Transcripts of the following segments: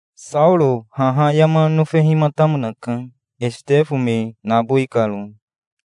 Saoro haha yama nofehimatamonaka, Esitefo me nabowi karo.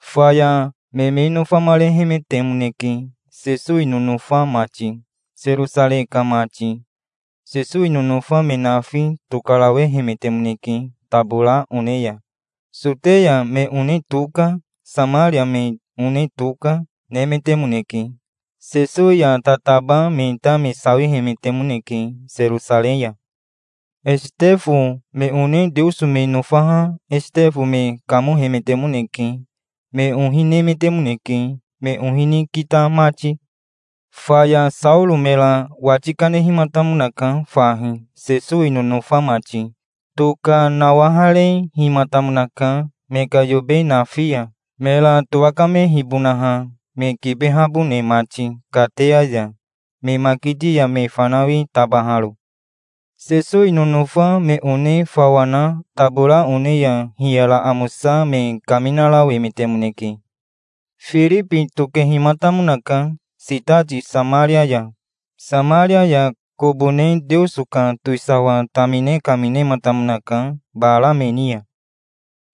Faya me me nofamarehemetemoneke, Sesowi nonofa mati, Serosarei ka mati. Sesowi nonofa me nafi tokarawehemetemoneke tabora one ya. Soteya me one toka, Samaria me one toka, nemetemoneke. Sesowi ya tataba me ta me sawihemetemoneke Serosarei ya. Esitefo me one Teoso me nofaha Esitefo me kamohemetemoneke. Me ohi nemetemoneke, me ohi ni kita mati. Faya Saoro mera wati kanehimatamonaka fahi, Sesowi nonofa mati. Toka nawaharehimatamonaka, me ka yobe nafi ya, mera towakamehibonaha, me kibehabone mati kateya ya, me makiti ya me fanawi tabaharo. Sesowi nonofa me one fawa na tabora one ya hiyara amosa me kaminarawemetemoneke. Firibi tokehimatamonaka sitati Samaria ya. Samaria ya kobo ne Teoso ka towisawa tamine kaminematamonaka bara me ni ya.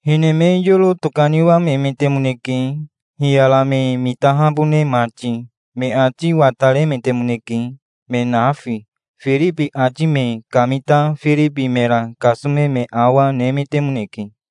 Hine me yoro tokaniwamemetemoneke, hiyara me mitahabone mati. Me ati wataremetemoneke, me nafi. Firibi ati me kamita Firibi mera kasome me awa, nemetemoneke.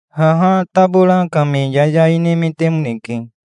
Haha tabora ka me yayai nemetemoneke.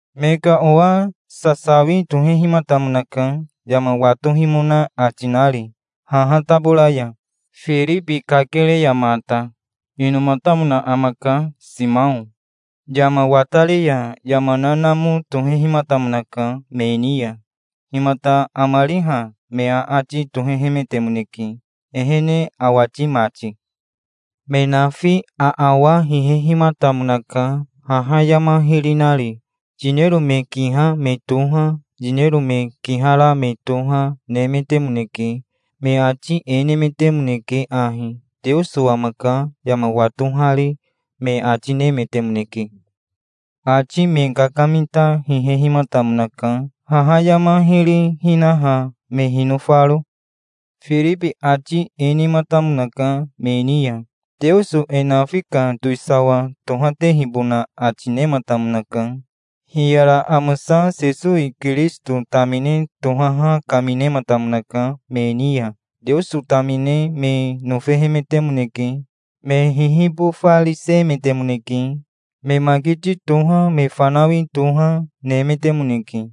Me ka owa sasawi tohehimatamonaka, yama watohimona ati nari haha tabora ya, Firibi kakere ya mata. Inomatamona amaka Simao. Yama watari ya yama nanamo tohehimatamonaka me ni ya. "Himata amari ha?" me aati tohehemetemoneke, ehene awati mati. Me nafi aawa hihehimatamonaka, haha yama hiri nari. Yinero me kiha me toha, yinero me kihara me toha, nemetemoneke. Me ati e nemetemoneke ahi: "Teoso amaka, yama watohari", me ati nemetemoneke. Ati me kakamita hihehimatamonaka, haha yama hiri hinaha me hinofaro. Firibi ati e nematamonaka me ni ya. Teoso e nafi ka towisawa tohatehibona ati nematamonaka. Hiyara amosa Sesowi Kirisito tamine tohaha kaminematamonaka me ni ya. Teoso tamine me nofehemetemoneke. Me hihibofarisemetemoneke. Me makiti toha, me fanawi toha, nemetemoneke.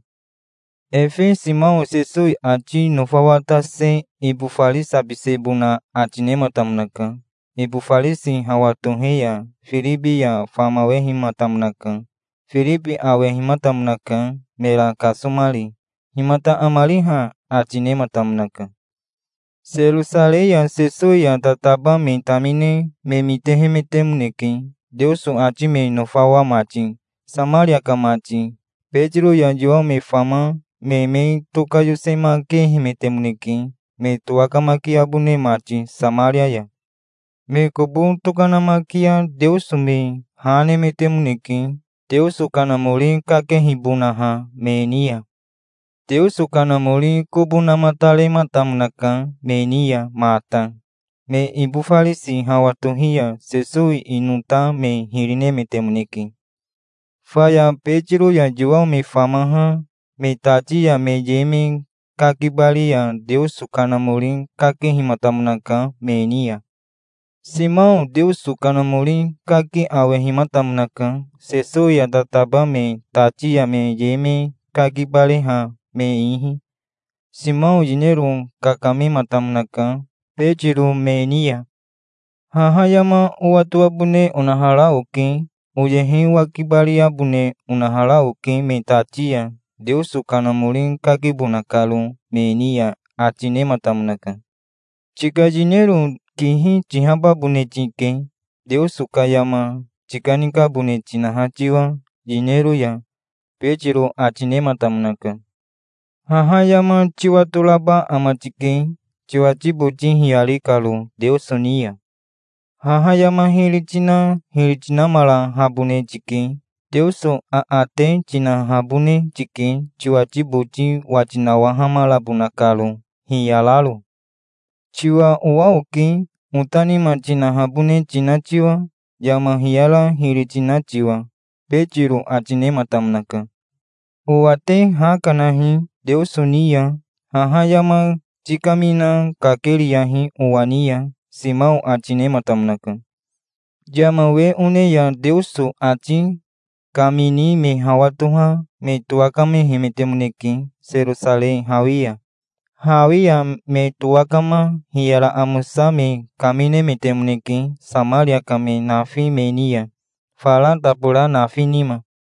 Efe Simao Sesowi ati nofawatase ibofarisabisebona ati nematamonaka. Ibofarisi hawa tohe ya Firibi ya famawehimatamonaka. Firibi awehimatamonaka, mera kasomari. "Himata amari ha?" ati nematamonaka. Serosarei ya Sesowi ya tataba me tamine me mitehemetemoneke, Teoso ati me nofawa mati, Samaria ka mati. Betiro ya Yowao me fama me me tokayosemakehemetemoneke, me towakamakiabone mati Samaria ya. Me kobo tokanamakia Teoso me ha nemetemoneke, Teoso Kanamori kakehibonaha me ni ya. Teoso Kanamori kobo namatarematamonaka me ni ya mata. Me ibofarisi hawa tohi ya Sesowi ino ta me hiri nemetemoneke. Faya Betiro ya Yowao me famaha me tati ya me ye me kakibari ya Teoso Kanamori kakehimatamonaka me ni ya. Simao Teoso Kanamori kaki awehimatamonaka, Sesowi ya tataba me tati ya me ye me kakibareha me ihi. Simao yinero kakamematamonaka Betiro me ni ya. "Haha yama owatoabone onahara oke. Oyehe owakibariabone onahara oke me tati ya, Teoso Kanamori kakibona karo me ni ya", ati nematamonaka. "Tika yinero kihi tihababone tike, Teoso ka yama tikanikabone tinaha tiwa yinero ya", Betiro ati nematamonaka. "Haha yama tiwatoraba ama tike, tiwati boti hiyari karo Teoso ni ya. Haha yama hiri tina hiri tinamarahabone tike. Teoso aate tinahabone tike tiwati boti wati nawahamarabona karo, hiyararo. Tiwa owa oke, ota nima tinahabone tina tiwa, yama hiyara hiri tina tiwa", Betiro ati nematamonaka. Owa te ha kanahi Teoso ni ya. Haha yama tikamina kakeriyahi owa ni ya, Simao ati nematamonaka. Yama we one ya Teoso ati kamini me hawa toha me towakamehemetemoneke Serosarei hawi ya. Hawi ya me towakama hiyara amosa me kaminemetemoneke Samaria ka me nafi me ni ya, fara tabora nafi nima.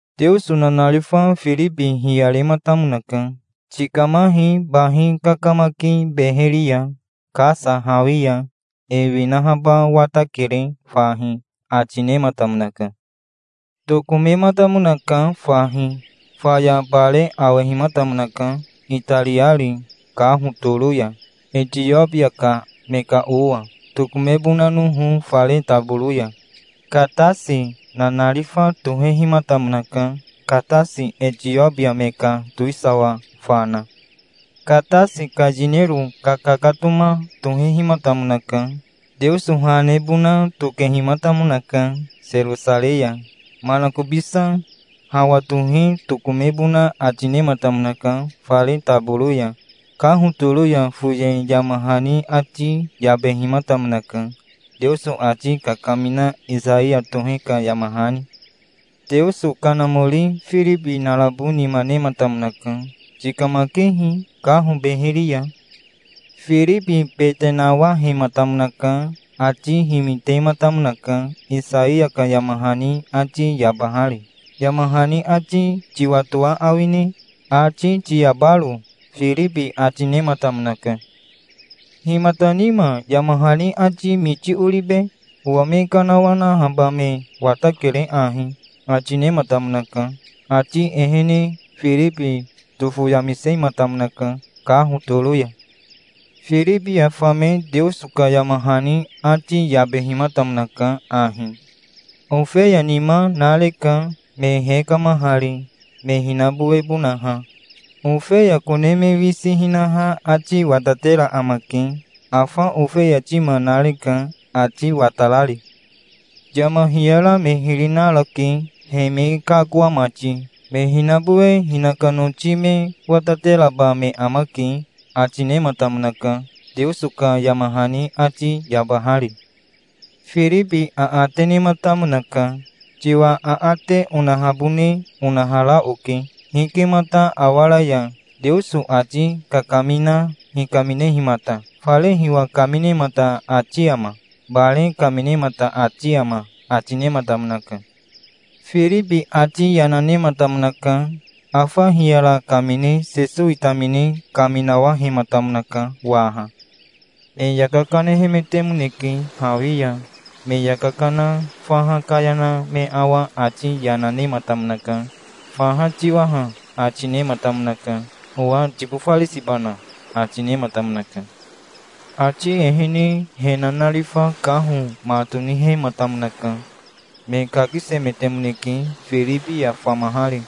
Teoso nanarifa Firibi hiyarematamonaka. "Tikamahi bahi kakamaki beheri ya, Kasa hawi ya. E winahaba watakere fahi", ati nematamonaka. Tokomematamonaka fahi. Faya bare awehimatamonaka, itariari kaho toro ya, Etiobia ka me ka owa, tokomebonanoho fare taboro ya. Katasi nanarifa tohehimatamonaka, Katasi Etiobia me ka towisawa fana. Katasi ka yinero kakakatoma tohehimatamonaka. Teoso ha nebona tokehimatamonaka Serosarei ya. Manakobisa hawa tohe tokomebona ati nematamonaka fare taboro ya. Kaho toro ya foye yama hani ati yabehimatamonaka, Teoso ati kakamina Isaiya tohe ka yama hani. Teoso Kanamori Firibi narabo nima nematamonaka. "Tikamakehi kaho beheri ya". Firibi bete nawahematamonaka. Ati himitematamonaka, Isaiya ka yama hani ati yabahari. "Yama hani ati tiwatoa awine, ati tiyabaro?" Firibi ati nematamonaka. "Himata nima yama hani ati miti oribe? Owa me kanawanahaba me watakere ahi", ati nematamonaka. Ati ehene Firibi tofoyamisematamonaka kaho toro ya. Firibi ya fame Teoso ka yama hani ati yabehimatamonaka ahi: "Ofeya nima nareka, me hekamahari, me hinabowebonaha. Ofeya kone me wisi hinaha ati watatera amake. Afa ofeya tima nareka, ati watarari. Yama hiyara me hiri narake, he me kakoa mati. Me hinabowe hinaka noti me watateraba me amake", ati nematamonaka, Teoso ka yama hani ati yabahari. Firibi aate nematamonaka. "Tiwa aate onahabone onahara oke. Hikemata awaraya, Teoso ati kakamina hikaminehimata? Fare hiwa kaminemata ati ama? Bare kaminemata ati ama?" ati nematamonaka. Firibi ati yana nematamonaka. Afa hiyara kamine Sesowi tamine kaminawahematamonaka waha. Me yaka kanehemetemoneke hawi ya. Me yaka kana fa kaya na me awa ati yana nematamonaka. "Faha tiwa ha", ati nematamonaka. 'Owa tibofarisibana?" ati nematamonaka. Ati ehene he nanarifa kaho ma tonihematamonaka. Me kakisemetemoneke, Firibi ya famahari.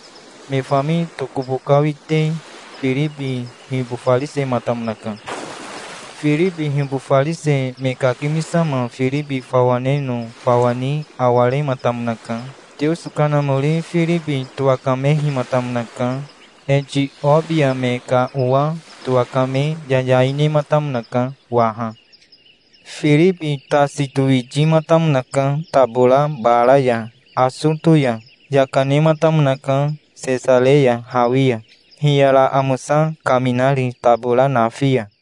Me fami tokobokawite Firibi hibofarisematamonaka. Firibi hibofarise me kakimisama Firibi fawa neno fawa ni awarematamonaka. Teoso Kanamori Firibi towakamehimatamonaka. Etiobia me ka owa towakame yayai nematamonaka waha. Firibi tasi towitimatamonaka tabora bara ya, Asoto ya. Yaka nematamonaka Sesareya hawi ya, hiyara amosa kaminari tabora nafi ya.